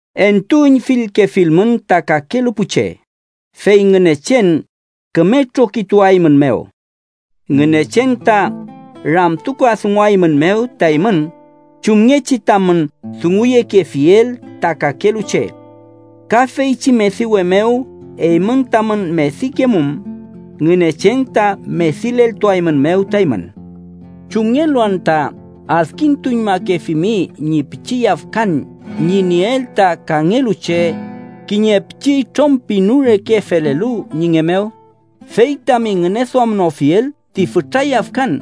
“Entuüñfilkefilmün ta kakelu pu che, fey Ngünechen küme trokituaeymünmew. Ngünechen ta ramtukadunguaeymünmew ta eymün chumngechi tamün dunguyekefiel ta kakelu che. Ka feychi mediwe mew eymün tamün medikemum, Ngünechen ta medileltuaeymünmew ta eymün. “¿Chumngelu anta adkintuñmakefimi ñi pichi yafkan ñi nieel ta kangelu che kiñe pichi itrom pinu reke felelu ñi nge mew, fey tami ngüneduamnofiel ti fütra yafkan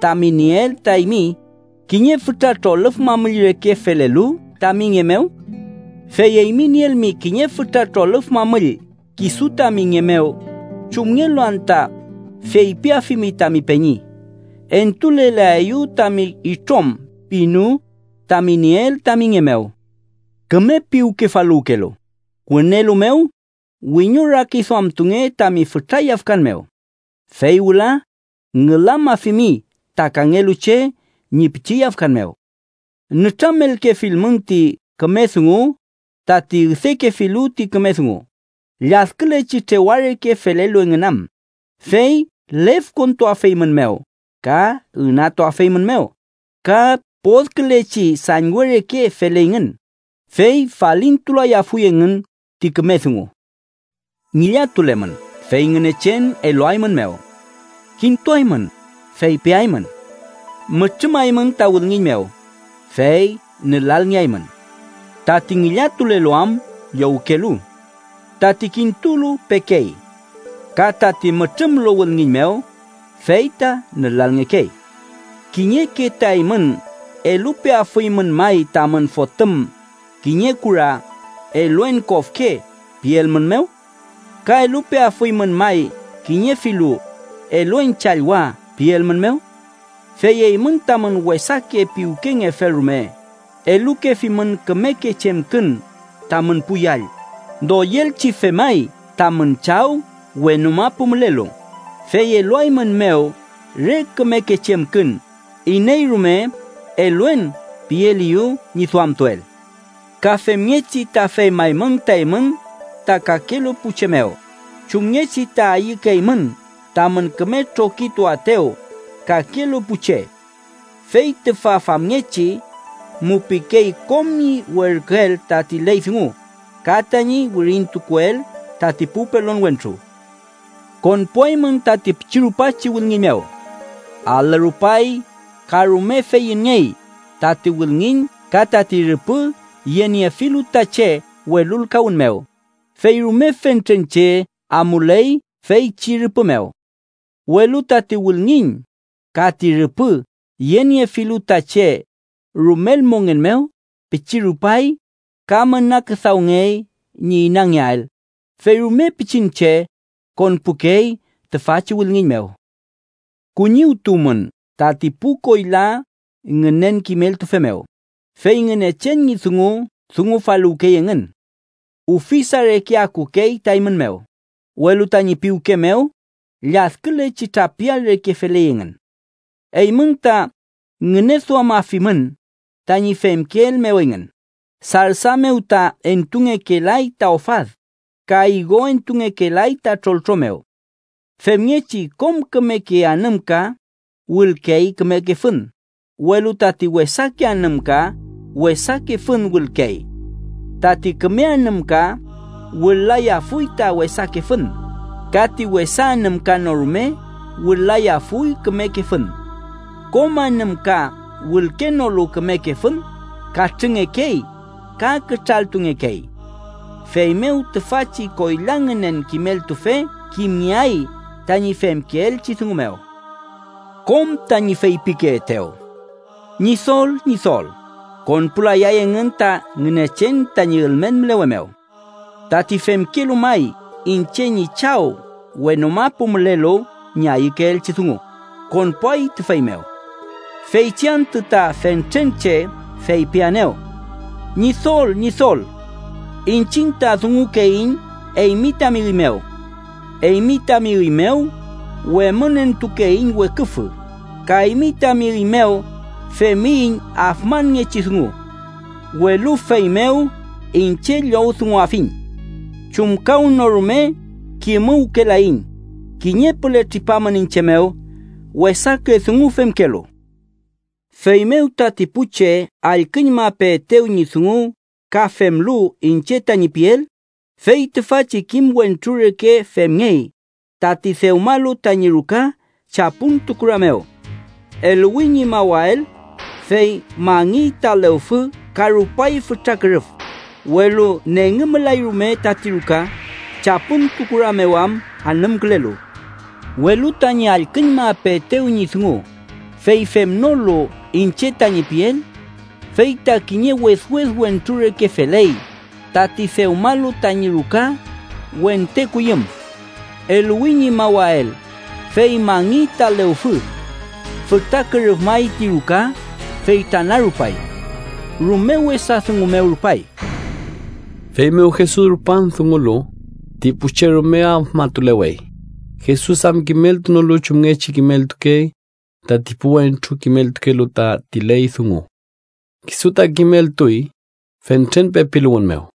tami nieel ta eymi kiñe fütra trolüf mamüll reke felelu tami nge mew? Fey eymi nielmi kiñe fütra trolüf mamüll kisu tami nge mew, ¿chumngelu anta feypiafimi tami peñi: ‘Entulelaeyu tami itrom pinu tami nieel tami nge mew’? ¡Küme piwkefaluwkelu! Wünelu mew wiñorakiduamtunge tami fütra yafkan mew, fey wüla ngülamafimi ta kangelu che ñi pichi yafkan mew. “Nütramelkefilmün ti küme dungu tati üdekefilu ti küme dungu lladkülechi trewa reke felelu engün am, fey lefkontuafeymünmew ka ünatuafeymünmew, ka podkülechi sañwe reke feleyngün, fey falintulayafuy engün ti küme dungu. “Ngillatulemün, fey Ngünechen eluaeymünmew. Kintuaymün, fey peaymün. Mütrümaymün ta wülngiñ mew, fey nülalngeaymün. Tati ngillatulelu am, llowkey. Tati kintulu, pekey. Ka tati mütrümlu wülngiñ mew, fey ta nülalngekey. “¿Kiñeke ta eymün elupeafuymün may tamün fotüm kiñe kura, ‘eluen kofke’ pielmünmew? ¿Ka elupeafuymün may kiñe filu ‘eluen challwa’ pielmünmew? Fey eymün, tamün wesake piwkengefel rume, elukefimün kümeke chemkün tamün pu yall, ¡doyelchi femay tamün Chaw wenu mapu mülelu, fey eluaeymünmew re kümeke chemkün iney rume ‘eluen’ pieleyew ñi duamtuel! Ka femngechi ta femaymün ta eymün ta kakelu pu che mew chumngechi ta ayükeymün tamün küme trokituaetew kakelu pu che. Fey tüfa famngechi mupikey kom ñi werküel tati ley dungu ka tañi wirintukuel tati pu pelon wentru. “Konpuaymün tati pichi rupachi wülngiñ mew. Alü rupay ka rume feyünngey tati wülngiñ ka tati rüpü yeniefilu ta che welulkawün mew, fey rume fentren che amuley feychi rüpü mew. Welu tati wülngiñ ka ti rüpü yeniefilu ta che rumel mongen mew, pichi rupay ka müna küdawngey ñi inangeael, fey rume pichin che konpukey tüfachi wülngiñ mew. “Kuñiwtuwmün tati pu koyla ngünen kimeltufe mew, fey Ngünechen ñi dungu dungufaluwkey engün. Ufisa reke akukey ta eymün mew, welu tañi piwke mew lladkülechi trapial reke feley engün. Eymün ta ngüneduamafimün tañi femkeel mew engün, sarsa mew ta entungekelay ta ofad, ka igo entungekelay ta troltro mew. Femngechi, kom kümeke anümka wülkey kümeke fün, welu tati wesake anümka wesake fün wülkey. Tati küme anümka wül-layafuy ta wesake fün, ka ti wesa anümka no rume wül-layafuy kümeke fün. Kom anümka wülkenolu kümeke fün, katrüngekey ka kütraltungekey. Feymew tüfachi koyla ngünen kimeltufe kimngeay tañi femkeelchi dungu mew. “Kom tañi feypikeetew: ‘Ñidol, Ñidol’, konpulayay engün ta Ngünechen tañi ülmen mülewe mew. Tati femkelu may iñche ñi Chaw wenu mapu mülelu ñi ayükeelchi dungu, konpuay tüfey mew. Feychi antü ta fentren che feypiaenew: ‘Ñidol, Ñidol’, iñchiñ ta dungukeiñ eymi tami üy mew. Eymi tami üy mew wemünentukeiñ weküfü, ka eymi tami üy mew femiyiñ afmanngechi dungu. Welu feymew iñche llowdunguafiñ: ‘Chumkawnorume kimuwkelayiñ. ¡Kiñe püle tripamün iñche mew, wesake dungu femkelu!’ “Feymew tati pu che allküñmapeetew ñi dungu ka femlu iñche tañi piel, fey tüfachi kim wentru reke femngey tati dewmalu tañi ruka chapüntu kura mew. Eluwi ñi mawael, fey mangiy ta lewfü ka rupay fütra kürüf, welu nengümlay rume tati ruka, chapüntu kura mew am anümkülelu. Welu tañi allküñmapeetew ñi dungu, fey femnolu iñche tañi piel, fey ta kiñe wedwed wentru reke feley tati dewmalu tañi ruka wente kuyüm. Eluwi ñi mawael, fey mangiy ta lewfü. Fütra kürüfmay ti ruka, fey tranarupay. ¡Rume wesa dungu mew rupay!” Feymew Jesus rupan dungulu, ti pu che rume afmatulewey, Jesus am kimeltunolu chumngechi kimeltukey tati pu wentru kimeltukelu tati ley dungu. Kisu ta kimeltuy fentren pepiluwün mew.